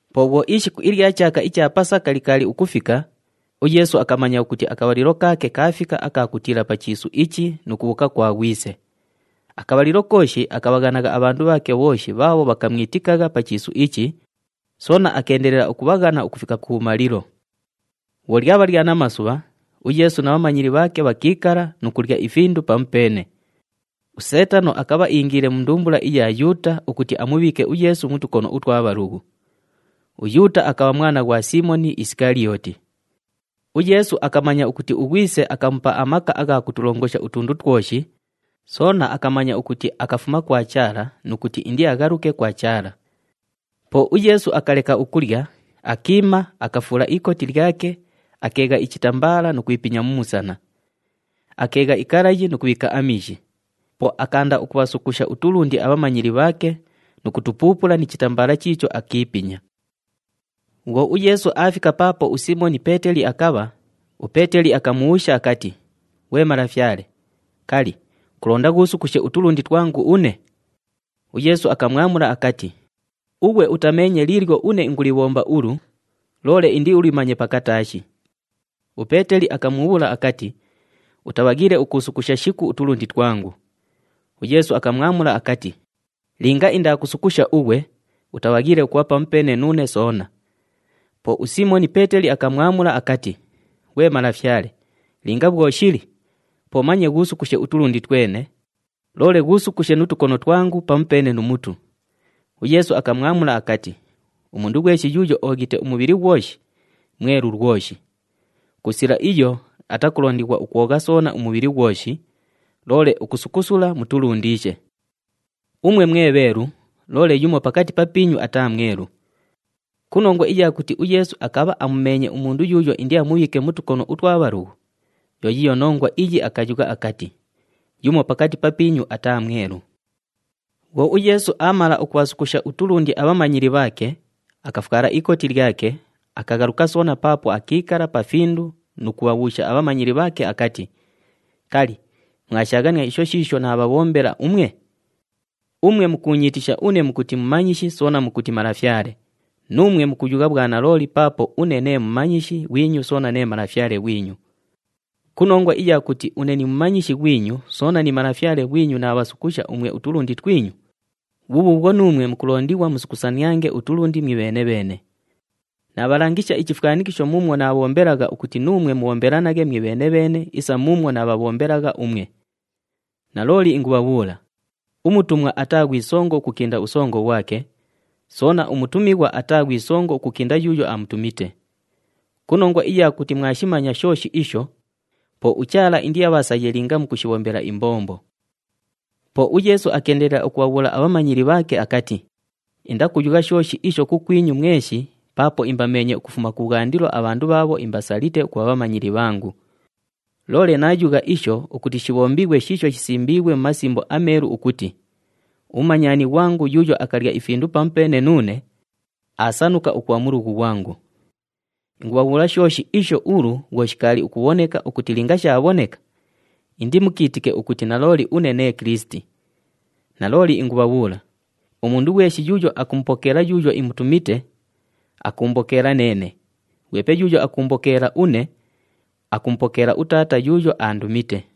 Po bhwo ishiku ilya chaaka icha Pasaka likaali ukufika, uYeesu akamanya ukuti akabhalilo kaake kaafika aka kutiila pa chiisu ichi nu kubhuuka kwa Ghwise. Akabhalilo kooshi akabhaghanagha abhandu bhaake bhooshi bhaabho bhakamwitikagha pa chiisu ichi, soona akeendelela ukubhaghana ukufika kubhumalilo. Bhwo lyabha lya namasubha, uYeesu na bhamanyili bhaake bhakiikala nu kulya ifindu pamupeene. USeetano akabha iingiile mu ndumbula iya Yuuta ukuti amubhiike uYeesu mu tukono utwa bhalughu. UYuuta akabha mwana ghwa Siimoni Isikaliyooti. UYeesu akamanya ukuti uGhwise akamupa amaka agha kutulongosha utundu twoshi, soona akamanya ukuti akafuma kwa Chaala nu kuti indiaghaluke kwa Chaala. Po uYeesu akaleka ukulya, akiima, akafuula ikoti lyake, akeegha ichitambaala nu kwipinya mu musana. Akeegha ikalayi nu kubhiika amiishi. Po akaanda ukubhasukusha utulundi abhamanyili bhaake nu kutupuupula ni chitambaala chiicho akiipinya. Bhwo uYeesu aafika paapo uSiimoni Peeteli akabha, uPeeteli akamubhuusha akati, “Ghwe Malafyale, kali, kulonda ghuusukushe utulundi twangu une?” UYeesu akamwamula akati, “Ughwe utameenye liilyo une ingulibhomba ulu, loole indiulimanye pakataashi.” UPeeteli akamubhuula akati, “Utabhaghiile ukuusukusha shiku utulundi twangu.” UYeesu akamwamula akati, “Linga indaakusukusha ughwe, utabhaghiile ukubha pamupeene nuune soona.” Po uSiimoni Peeteli akamwamula akati, “Ghwe Malafyale, linga bhwo shili, po manye ghuusukushe utulundi twene, loole ghuusukushe nu tukono twangu pamupeene nu mutu.” UYeesu akamwamula akati, “Umundu ghweshi yuuyo ooghite umubhili ghwoshi, mwelu lwoshi. Ku sila iyo atakulondighwa ukwogha soona umubhili ghwoshi, loole ukusukusula mu tulundiishe. Umwe mwe bheelu, loole yumo pakati papiinyu ataa mwelu.” Ku nongwa iya kuti uYeesu akabha amumeenye umundu yuuyo indiamubhiike mu tukono utwa bhalughu, yo yiiyo nongwa iyi akayugha akati, “Yumo pakati papiinyu ataa mwelu.” Bhwo uYeesu aamala ukubhasukusha utulundi abhamanyili bhaake, akafwala ikoti lyake, akaghaluka soona paapo akiikala pa findu nu kubhabhuusha abhamanyili bhaake akati, “Kali, mwashaaghania isho shiisho naabhabhombela umwe? Umwe mukuunyiitisha une mukuti Mumanyishi soona mukuti Malafyale, nuumwe mukuyugha bhwanalooli paapo une nee Mumanyishi ghwinyu soona nee Malafyale ghwinyu. Ku nongwa iya kuti une ni Mumanyishi ghwinyu soona ni Malafyale ghwinyu naabhasukusha umwe utulundi twinyu, bhubhuubhwo nuumwe mukulondighwa musukusaniange utulundi mwibheene-bheene. Naabhalangisha ichifwanikisho muumwo naabhombelagha ukuti nuumwe mubhombelanaghe mwibheene-bheene isa muumwo naabhabhombelagha umwe. Nalooli ingubhabhuula, umutumwa ataa ghwi songo ukukinda usongo ghwake, soona umutumighwa ataa ghwi songo ukukinda yuuyo amutumite. Ku nongwa iya kuti mwashimanya shooshi isho, po uChaala indiabhasaye linga mukushibhombela imbombo.” Po uYeesu akeendelela ukubhabhuula abhamanyili bhaake akati, “Indakuyugha shooshi isho kukwinyu mweshi paapo imbameenye ukufuma kubhwandilo abhandu bhaabho imbasalite ukubha bhamanyili bhangu. Loole naayugha isho ukuti shibhombighwe shiisho shisimbiighwe mu Masimbo aMeelu ukuti, ‘Umumanyani ghwangu yuuyo akalya ifindu pamupeene nuune, aasanuka ukubha mulughu ghwangu.’ Ingubhabhuula shooshi isho ulu bhwo shikaali ukubhoneka ukuti linga shaabhoneka, indimukiitike ukuti nalooli une nee Kilisiti. Nalooli ingubhabhuula, umundu ghweshi yuuyo akumupokeela yuuyo imutumite, akuumbokeela neene, ghwepe yuuyo akuumbokeela une, akumupokeela uTaata yuuyo aandumite.”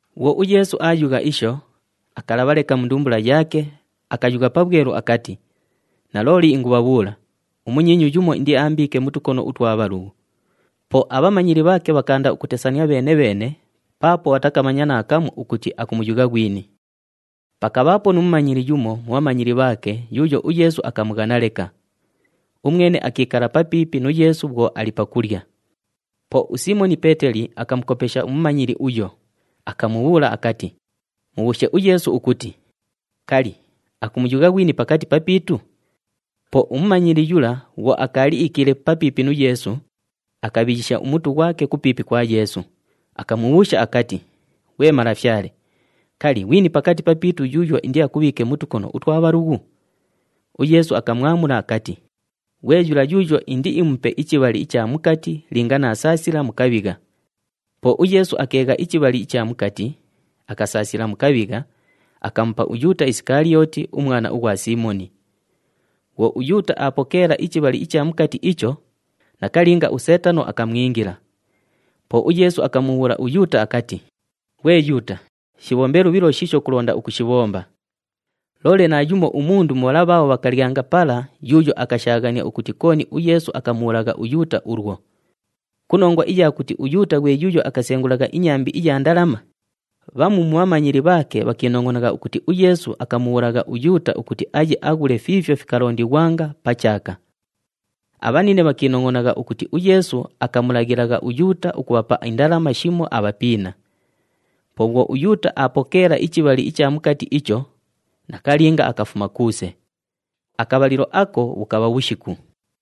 Bhwo uYeesu aayugha isho, akalabha leka mu ndumbula yaake, akayugha pabhwelu akati, “Nalooli ingubhabhuula, umunyiinyu yumo indiaambiike mu tukono utwa bhalughu.” Po abhamanyili bhaake bhakaanda ukutesania bheene-bheene paapo bhatakamanya naakamu ukuti akumuyugha ghwini. Pakabhaapo nu mumanyili yumo mu bhamanyili bhaake yuuyo uYeesu akamughana leka. Umwene akiikala papiipi nu Yeesu bhwo ali pakulya. Po uSiimoni Peeteli akamukopesha umumanyili uyo, akamubhuula akati, “Mubhuushe uYeesu ukuti, kali, akumuyugha ghwini pakati papiitu?” Po umumanyili yula bhwo akaali iikiile papiipi nu Yeesu, akabhiyisha umutu ghwake kupiipi kwa Yeesu, akamubhuusha akati, “Ghwe Malafyale, kali, ghwini pakati papiitu yuuyo indiakubhiike mu tukono utwa bhalughu?” UYeesu akamwamula akati, “Ghwe yula yuuyo indiimupe ichibhali icha mukati linga naasaasila mu kabhigha.” Po uYeesu akeegha ichibhali icha mukati, akasaasila mu kabhigha, akamupa uYuuta Isikaliyooti, umwana ughwa Siimoni. Bhwo uYuuta aapokeela ichibhali icha mukati icho, nakalinga, uSeetano akamwingila. Po uYeesu akamubhuula uYuuta akati, “Ghwe Yuuta, shibhombe lubhilo shiisho kulonda ukushibhomba!” Loole naayumo umundu mu bhala bhaabho bhakalyanga pala yuuyo akashaaghania ukuti kooni uYeesu akamubhuulagha uYuuta ulwo. Ku nongwa iya kuti uYuuta ghwe yuuyo akasengulagha inyambi iya ndalama, bhamu mu bhamanyili bhaake bhakiinongʼonagha ukuti uYeesu akamubhuulagha uYuuta ukuti aye aghule fiifyo fikalondighwanga pa chaaka. Abhanine bhakiinongʼonagha ukuti uYeesu akamulaghilagha uYuuta ukubhapa indalama shimo abhapiina. Po bhwo uYuuta aapokeela ichibhali icha mukati icho, nakalinga akafuma kuuse. Akabhalilo ako bhukabha bhushiku.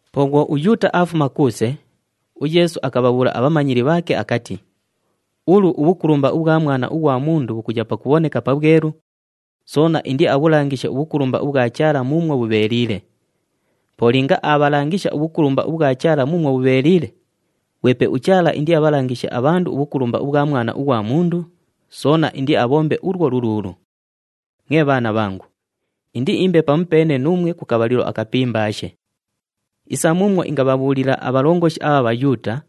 Po bhwo uYuuta aafuma kuuse, uYeesu akabhabhuula abhamanyili bhaake akati, “Ulu ubhukulumba ubhwa Mwana ughwa Mundu bhukuya pakubhoneka pabhwelu, soona indiabhulangishe ubhukulumba ubhwa Chaala muumwo bhubheeliile. Po linga aabhalangisha ubhukulumba ubhwa Chaala muumwo bhubheeliile, ghwepe uChaala indiabhalangishe abhandu ubhukulumba ubhwa Mwana ughwa Mundu, soona indiabhombe ulwo luluulu. Mwe bhaana bhangu, indiimbe pamupeene nuumwe ku kabhalilo akapimbaashe. Isa muumwo ingabhabhuulila abhalongoshi abha Bhayuuta,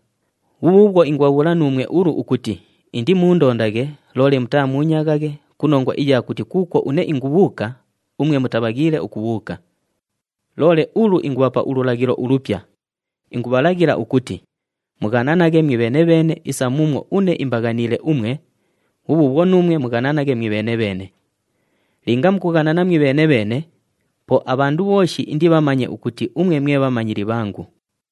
bhubhuubhwo ingubhabhuula nuumwe ulu ukuti indimuundondaghe, loole mutaamuunyaaghaghe ku nongwa iya kuti kuukwo une ingubhuuka, umwe mutabhaghiile ukubhuuka. Loole ulu ingubhapa ululaghilo ulupya, ingubhalaghila ukuti, ‘Mughananaghe mwibheene-bheene isa muumwo une imbaghaniile umwe, bhubhuubhwo nuumwe mughananaghe bheene-bheene.’ Linga mukughanana mwibheene-bheene, po abhandu bhooshi indibhamanye ukuti umwe mwe bhamanyili bhangu.”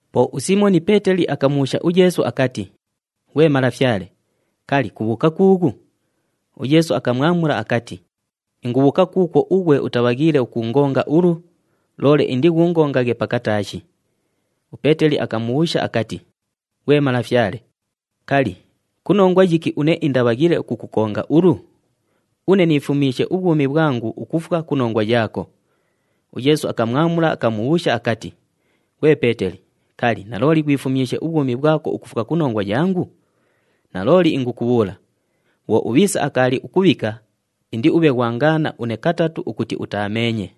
Po uSiimoni Peeteli akamubhuusha uYeesu akati, “Ghwe Malafyale, kali, kubhuuka kuughu?” UYeesu akamwamula akati, “Ingubhuuka kuukwo ughwe utabhaghiile ukuungonga ulu, loole indighuungonge pakataashi.” UPeeteli akamubhuusha akati, “Ghwe Malafyale, kali, ku nongwa yiki une indabhaghiile ukukukonga ulu? Une niifumyishe ubhwumi bhwangu ukufwa ku nongwa yaako!” UYeesu akamwamula, akamubhuusha akati, “Ghwe Peeteli, kali, nalooli ghwifumyishe ubhwumi bhwako ukufwa ku nongwa yangu? Nalooli ingukubhuula, bhwo ubhiisa akaali ukubhika, indiubhe ghwangaana une katatu ukuti utaameenye.”